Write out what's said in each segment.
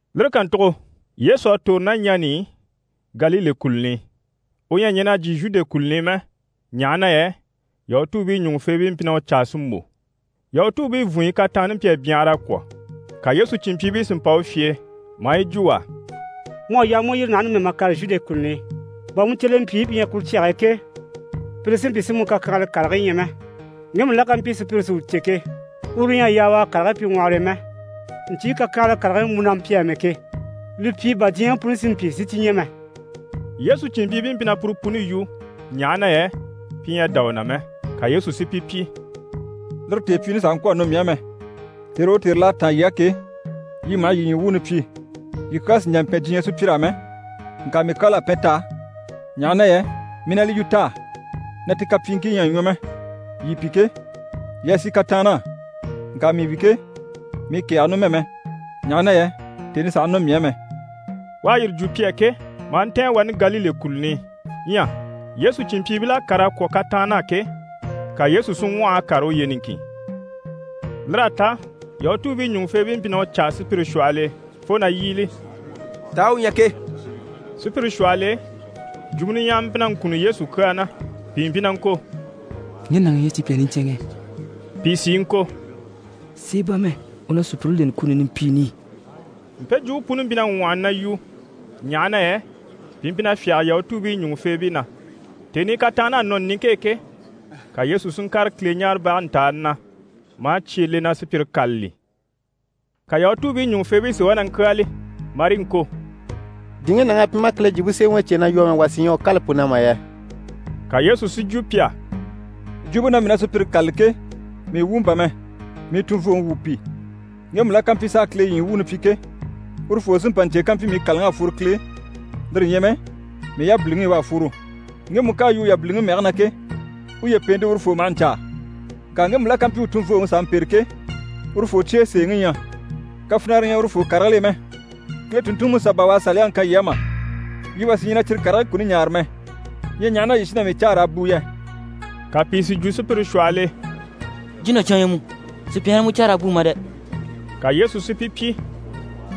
Lire kàntugo Yesu à tòro ná ɲani i Galile kùluni i, u ɲyɛ a ɲɛn'a jyè Zhude kùluni i mɛ, ɲaha na yɛ Yahutuubii ɲùŋufeebii mpyi na u caa si mbò. Yahutuubii vùnɲyi kataanni mpyi a byanhara a kwɔ̀. Ka Yesu cìnmpyiibii si mpa u fye e, maa yi jwo u á: «Mu à yaa mu u yîri naha numɛ mà kàre Zhude kùluni i, bà mu cyelempyiibii pi ɲyɛ kuru cyage e ke, pire si mpyi si mu kakyanhala karigii ɲya mɛ. Ŋgemu la ká mpyi sùpyire si u cè ke, uru ɲyɛ a yaa u a karigii pyi ŋwɔhɔre e mɛ. Ɲcyii kakyanhala karigii mu na mpyi amɛ ke, li pyi bà diɲyɛŋi puni si mpyi si cyi ɲya mɛ.» Yesu cìnmpyiibii mpyi na puru puni yu, ɲaha na yɛ pi ɲyɛ a dá u na mɛ. Ka Yesu si pi pyi: «Lire tèepyiini sàha ŋkwɔ̀ a nɔ mii á mɛ. Tère o tère l'à táan yii á ke, yii maha yii ɲyii wuuni pyi. Yii kyaa sì n‑jà n‑pɛn diɲyɛ sùpyir'á mɛ, ŋka mii kyal'à pɛn t'á, ɲaha na yɛ mii na li yu t'á na ti kapyiiŋkii ɲyɛ a ɲwɔ mɛ. Yii pi ke, yii a sì kataann'á. Ŋka mii wi ke, mii kɛ̀ɛge numɛ mɛ, ɲaha na yɛ tèni sàha nɔ mii á mɛ.» U à yire jwo pi á ke, maa ntɛ̀ɛn wani Galile kùluni i. Ɲyɛ Yesu cìnmpyiibil'à kàr'a kwɔ̀ kataann'á ke, ka Yesu si ŋwɔh'a kàre uye niŋkin. Lir'à ta Yahutuubii ɲùŋufeebii mpyi na u caa sùpyire shwɔhɔl'e, fo na yíbili: «Taa u ɲyɛ ke?» Sùpyire shwɔhɔl'e, jwumɔ niɲyahama mpyi na ŋkunni Yesu kyaa na. Pìi mpyi na ŋko: «Ŋge nàŋi ɲyɛ sùpya niɲcɛnŋɛ» pìi sí i ŋko: «Sèe bà mɛ, u na sùpyire leni kuni nimpiini i.» Mpe jwumpe puni mpyi na ŋwɔhɔni na yu, ɲaha na yɛ pi mpyi na fyáge Yahutuubii ɲùŋufeebii na. Tèni i kataann'à nɔ niŋke e ke, ka Yesu si ŋkàre Kileɲaarebage ntàani na, maa cye le na sùpyire kâlali. Ka Yahutuubii ɲùŋufeebii si wá na ŋkyáali marii ŋko: «Di ŋge nàŋ'à pyi maa Kile Jwumpe Semɛŋi cè na yu amɛ, wà sí ɲyɛ a u kâla pu na mà yɛ?» Ka Yesu si jwo pi á: «Jwumpe na mii na sùpyire kâlali ke, mii wumɔ bà mɛ, mii tunvooŋi wumɔ pi. Ŋgemu la ká mpyi s'a Kile ɲyii wuuni pyi ke, urufoo sí n‑pa n‑cè kampyi mii kàlaŋ'à fworo Kile e, lire ɲyɛ mɛ mii yabiliŋi i u à fworo. Ŋgemu ká a yu u yabiliŋi mɛge na ke, uye pèente urufoo maha ɲcaa. Ŋka ŋgemu la ká mpyi u tunvooŋi s'a mpêre ke, urufoo cye e sèeŋi ɲyɛ. Kafinara ɲyɛ urufoo karigil'e mɛ. Kile tùnntunŋiMusa bà u à Saliyaŋi kan yii á mà? Yii wà sí ɲyɛ na cyire karigii kuni ɲaare mɛ. Ɲyɛ ɲaha na yii sí na mii caa raa bùu yɛ?» Ka pìi si jwo sùpyire shwɔhɔl'e: «Jínacyan u ɲyɛ mu, sùpya ɲyɛ na mu caa raa bùu mà dɛ!» Ka Yesu si pi pyi: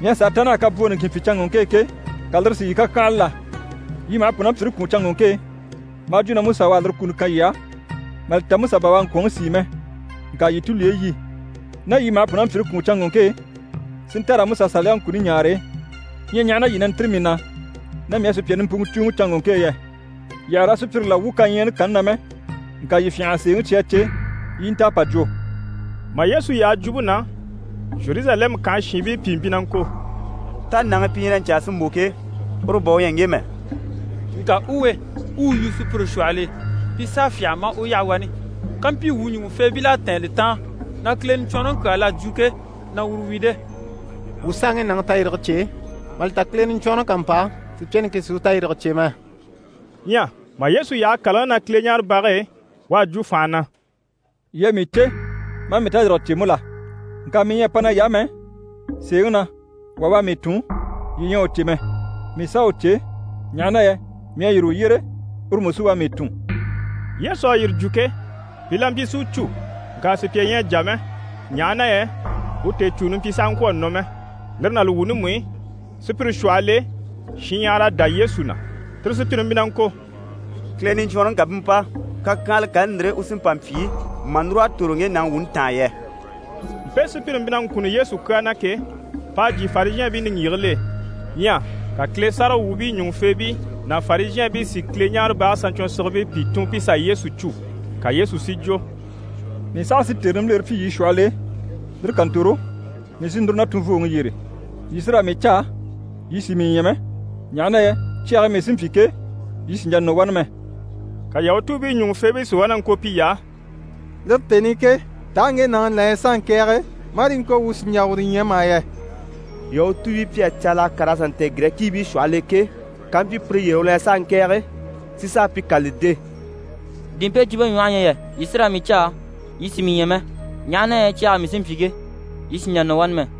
«Mii à sàa ta naha kabwoo niŋkin pyi canŋɔŋke e ke, ka lire si yii kàkyahanla la? Yii maha pùnampyire kwùun canŋɔŋke e, maa jwo na Musa u à lire kuni kan yii á (mà li ta Musa bà u à ŋkwɔ̀nŋi sìi mɛ, ŋka yii tulyeyi yi.) Ná yii maha pùnampyire kwùun canŋɔŋke e, si nta raa Musa Saliyaŋi kuni ɲaare, ɲyɛ ɲaha na yii na ntîri mii na na mii à sùpya nimpuŋɔ cùuŋɔ canŋɔŋke e yɛ? Yii àha raa sùpyire la wwû kaɲyaani kanni na mɛ, ŋka yii fyânha a sèeŋi cya yii cè, yii i nta a pà jwo.» Mà Yesu yaha jwumpe na, Zheruzalɛmu kànhe shiinbii pìi mpyi na ŋko: «Tá nàŋi pi na ɲcaa si mbò ke, uru bà u ɲyɛ ŋge mɛ? Ŋka u we, u u yu sùpyire shwɔhɔl'e, pi s'à fyâha maa u yaha wani. Kampyi wuu ɲùŋufeebil'à tɛ̀ɛn li taan na Kile Niɲcwɔnrɔŋi kyaa l'à jwo ke, na uru wi de? Wuu s'à ŋge nàŋi tayirige cè, mà li ta Kile Niɲcwɔnrɔŋi ká mpa, sùpya niŋkin sì u tayirige cè mɛ.» Ɲyɛ mà Yesu yaha kàlaŋi na Kileɲaarebage e, u à jwo fànha na: «Yii à mii cè, maa mii tayirige cè mú la? Ŋka mii ɲyɛ a pa nay'á mɛ, sèeŋi na wà u à mii tun, yii ɲyɛ a u cè mɛ. Mii s'à u cè, ɲaha na yɛ mii à yîri u yyére, uru mú sí u à mii tun.» Yesu à yire jwo ke, pi la mpyi si u cû. Ŋka sùpya ɲyɛ a jà mɛ, ɲaha na yɛ u tèecûni mpyi na sàha ŋkwɔ̀ a nɔ mɛ. Lire ná li wuuni mú i, sùpyire shwɔhɔl'e shinɲyahara à dá Yesu na, tire sùpyire mpyi na ŋko: «Kile Niɲcwɔnrɔŋi ká bú mpa, kakyanhala kani ndire u sí n‑pa n‑pyi mà núr'a tòro ŋge nàŋi wuuni taan yɛ?» Mpe sùpyire mpyi na ŋkunni Yesu kyaa na ke, p'à jyè Farizhɛɛnbii niŋgyigigil'e. Ɲyɛ ka Kile sáragawwuubii ɲùŋufeebii ná Farizhɛɛnbii si Kileɲaarebage saɲcwɔnsigibii pìi tun pi sà Yesu cû. Ka Yesu si jwo: «Mii saha sí tère nimbilere pyi yii shwɔhɔl'e, lire ká ntòro, mii sí núru na tunvooŋi yyére. Yii sí raa mii caa, yii sì mii ɲya mɛ, ɲaha na yɛ cyage e mii sí n‑pyi ke, yii sì n‑jà nɔ wani mɛ.» Ka Yahutuubii ɲùŋufeebii si wá na ŋko piy'á: «Lire tèni i ke, taa ŋge nàŋi la ɲyɛ s'a ŋkɛ̀ɛge, marii ŋko na wuu sì n‑jà uru ɲya mà yɛ? Yahutuubii pi à caala a kàr'a sà ntɛ̀ɛn Girɛkiibii shwɔhɔl'e ke, kampyi pire yyére u la ɲyɛ s'a ŋkɛ̀ɛge, si sà a pi kâlali de? Di mpe jwumpe ɲwɔhe ɲyɛ yɛ “Yii sí raa mii caa, yii sì mii ɲya mɛ, ɲaha na yɛ cyage e mii sí n‑pyi ke, yii sì n‑jà nɔ wani mɛ”?»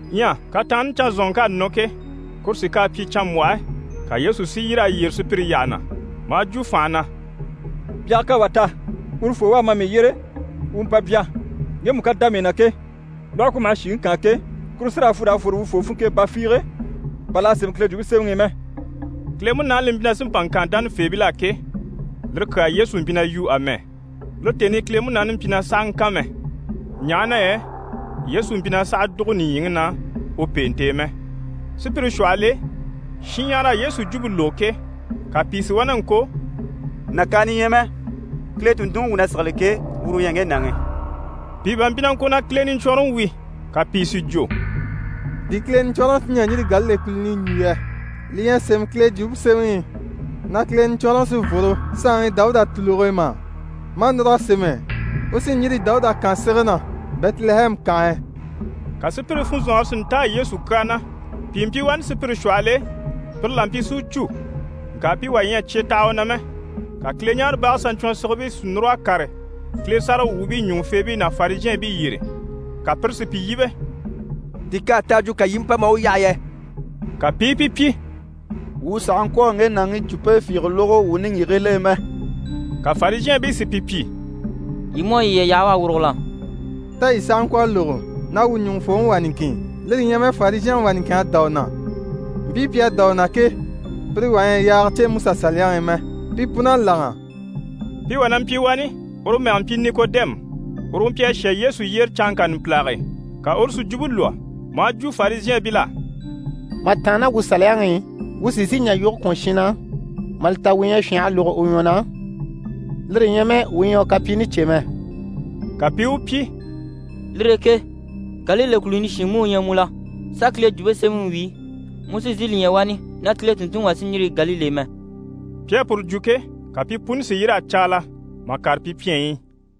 Ɲyɛ kataanni canzanŋk'à nɔ ke, kuru sí k'à pyi canmbwɔhe, ka Yesu si yîr'a yyere sùpyire yyaha na, maa jwo fànha na: «Byaga ká wà ta, urufoo u a ma mii yyére, u u mpa bya. Ŋgemu ká dá mii na ke, lwɔhe ku maha shìŋi kaan ke, kuru sí raa fwu raa fwore urufoo funŋke e ba fiige, bà l'à sémɛ Kile Jwumpe Semɛŋi i mɛ.» Kile Munaani li mpyi na sí n‑pa n‑kan dánafeebil'á ke, lire kyaa Yesu mpyi na yu amɛ. Lire tèni i Kile Munaani mpyi na sàha ŋkan mɛ, ɲaha na yɛ Yesu mpyi na sàha dùgo nìɲyiŋi na u pèente e mɛ. Sùpyire shwɔhɔl'e, shinɲyahara à Yesu jwumpe lógo ke, ka pìi si wá na ŋko: «Nàkaana ɲyɛ mɛ, Kile tùnntunŋi wuu na sigili ke, uru u ɲyɛ ŋge nàŋi.» Pìi bá mpyi na ŋko na Kile Niɲcwɔnrɔŋi wi. Ka pìi si jwo: «Di Kile Niɲcwɔnrɔŋi sí n‑jà n‑yîri Galile kùluni i n‑jwo yɛ? Li ɲyɛ a sémɛ Kile Jwumpe Semɛŋi i na Kile Niɲcwɔnrɔŋi sí n‑fworo saanŋi Dawuda tùluge e mà? Maa núr'a sémɛ “U sí n‑yîri Dawuda kànsege na, Bɛtilɛhɛmu kànhe e.”» Ka sùpyire funzɔnŋɔre si ntáa Yesu kyaa na. Pìi mpyi wani sùpyire shwɔhɔl'e, pire la mpyi si u cû, ŋka pi wà ɲyɛ a cye taha u na mɛ. Ka Kileɲaarebage saɲcwɔnsigibii si núr'a kàre Kile sáragawwuubii ɲùŋufeebii ná Farizhɛɛnbii yyére. Ka pire si pi yíbe: «Di k'à ta a jwo, ka yii i mpa maa u yaha yɛ?» Ka pi i pi pyi: «Wuu sàha ŋkwɔ̀ a ŋge nàŋi jwumpe fiige lógo wuu niŋgyigigil'e mɛ!» Ka Farizhɛɛnbii si pi pyi: «Yii mú à yiye yaha u à wurugo la? Tá yii sàha ŋkwɔ̀ a lógo na wuu ɲùŋufooŋi wà niŋkin, lire ɲyɛ mɛ Farizhɛnŋi wà niŋkin à dá u na? Mpii pi à dá u na ke, pire wà ɲyɛ a yaage cè MusaSaliyaŋi i mɛ, pi pun'à láŋa.» Pi wà na mpyi wani, uru mɛge mpyi Nikodɛmu. Uru u mpyi a shà Yesu yyére canŋka numpilage e. Ka uru si jwumpe lwɔ́, maa jwo Farizhɛɛnbil'á: «Mà tàanna ná wuu Saliyaŋi i, wuu sì n‑sìi n‑jà yoge kwɔ̀n shin na, mà li ta wuu ɲyɛ a fyânha a lógo u ɲwɔ na, lire ɲyɛ mɛ wuu ɲyɛ a u kapyiini cè mɛ.» Ka pi i u pyi: «Lire e ke Galile kùluni shin mú u ɲyɛ mu la? Sà Kile Jwumpe Semɛŋi wíi, mu sì n‑sìi li ɲya wani na Kile tùnntunŋi wà sí n‑yîri Galile e mɛ.» [ Pi à puru jwo ke, ka pi puni si yîr'a caala mà kàre pi pyɛnyi i.